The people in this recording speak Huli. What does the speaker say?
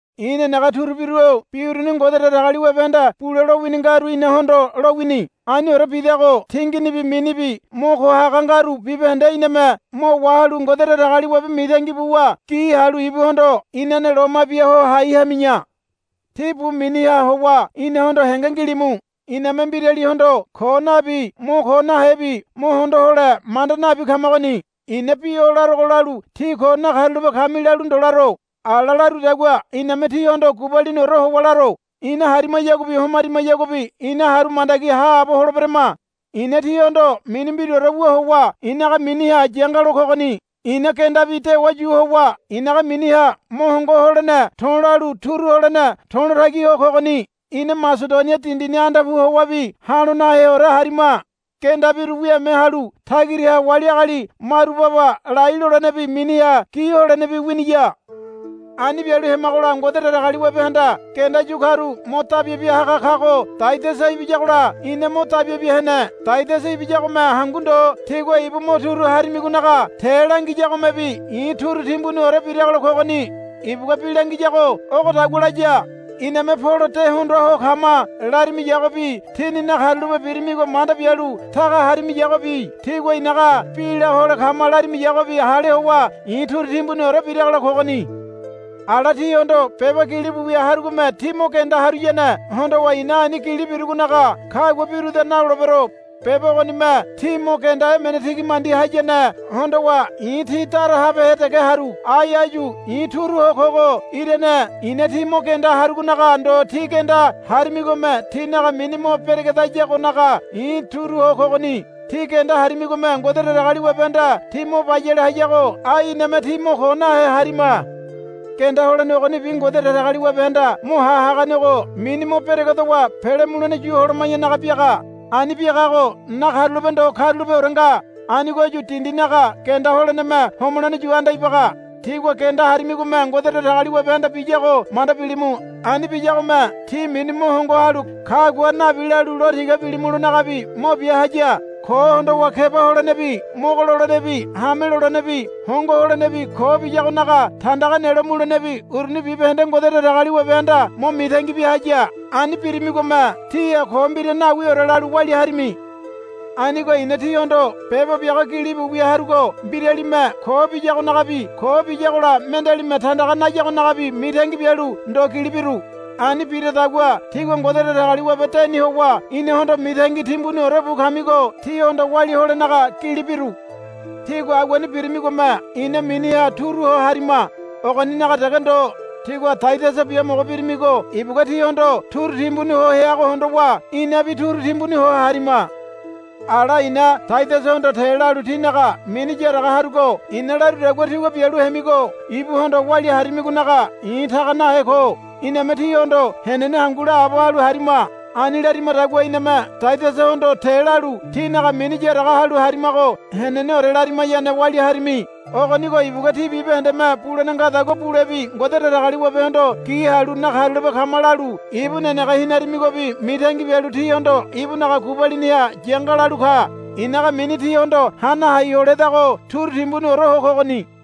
I̱ nenege turubiru-o bi uruni Ngode Datagaliwabehanda bule lowini ngaru inahondo lowini. Aniore bidago tinginibi minibi mo ko haga ngaru bibahende iname mo wahalu Ngode Datagaliwabe mitangi buwa gi halu ibuhondo inane loma bia ho hai hami̱ya. Tí bu miniha howa inahondo henge ngilimu. Iname mbiralihondo ko nabi mo ko nahebi mo hondo hole manda nabi kamagoni. I̱na bi o larogo lalu tí ko nakarulape kami lalu ndo laro. Ala larudagua iname tíhondo gubaliniore howa laro. Ina harimayaguabi homarimayaguabi ina haru mandagi haabo holeberama. I̱na tíhondo mini mbiraore wu howa i̱naga miniha yangalo kogoni. Ina gendabi dewa yu howa i̱naga miniha mo hongo holene to̱lalu turu holene to̱lo tagi ho kogoni. Ina Masedonia dindini anda pu howabi ha̱lo naheore harima. Gendabiru wiame halu tagiraha wali agali maru baba lai lolenebi miniha gi holenebi winiya. Ani bialu hemagola Ngode Datagaliwabehanda genda yu karu mo dabia bia haga kago Taidasa ibiyagola ina mo dabia bia hene. Taidasa ibiyagome hangu ndo tígua ibu mo turu harimigonaga te langiyagomebi i̱ turu timbuniore biragola kogoni. Ibugua bi langiyago ogodagua laya, Iname Polo de hondoa ho kama, larimiyagobi tíni nakarulape birimigo manda bialu taga harimiyagobi tígua i̱naga bi la hole kama larimiyagobi hale howa i̱ turu timbuniore biragola kogoni. Ala tíhondo beba gilibu wia harugome tí mo genda haruyane hondowa i̱na ani gili birugonaga kagua biruda nalolebero. Beba ogonime tí mo genda emene tigi mandi hayane hondowa i̱ tí dara habehe dege haru. Ai áyu i̱ turu ho kogo irane i̱na tí mo genda harugonaga ndo tí genda harimigome tínaga mini mo beregedayagonaga i̱ turu ho kogoni. Tí genda harimigome Ngode Datagaliwabehanda tí mo bayale hayago ai iname tí mo ko nahe harima. Genda holene ogonibi Ngode Datagaliwabehanda mo ha haganego mini mo beregedowa pele mulene yu holoma̱yanaga biaga. Ani biagago nakarulape ndo karulapeore nga. Anigoyu dindinaga genda holeneme homolene yu anda ibaga. Tígua genda harimigome Ngode Datagaliwabehanda biyago manda bilimu. Ani biyagome tí mini mo hongo halu kagua nabi lalu lo tiga bilimulonagabi mo bia haya. Ko hondowa keba holenebi mogo lolenebi hame lolenebi hongo holenebi ko biyagonaga tandaga nelo mulenebi uruni bibahende Ngode Datagaliwabehanda mo mitangi bia haya. Ani birimigome tíha ko mbira nawiore lalu walia harimi. Anigo i̱na tíhondo beba biago gilibu wia harugo mbiralime ko biyagonagabi ko biyagola mendealime tandaga nayagonagabi mitangi bialu ndo gili biru. Ani biradagua tígua Ngode Datagaliwabe deni howa inahondo mitangi timbuniore bu kamigo tíhondo walia holenaga gili biru. Tígua aguani birimigome ina miniha turu ho harima. Ogoninaga dege ndo. Tígua Taidasa biamogo birimigo ibugua tíhondo turu timbuni ho heago hondowa inabi turu timbuni ho harima. Ala i̱na Taidasahondo te lalu tínaga mini yaraga harugo i̱na larudagua tígua bialu hemigo ibuhondo walia harimigonaga i̱ taga nahe ko. Iname tíhondo henene hangu laabo halu harima. Ani larimadagua iname Taidasahondo te lalu tínaga mini yaraga halu harimago heneneore larimayane walia harimi. Ogonigo ibugua tí bibahendeme bulene ngadagua bulebi Ngode Datagaliwabehondo gi halu nakarulape kama lalu ibu nenege hinarimigobi mitangi bialu tíhondo ibunaga gubaliniha yanga lalu ka. I̱naga mini tíhondo hana hai holedago turu timbuniore ho kogoni.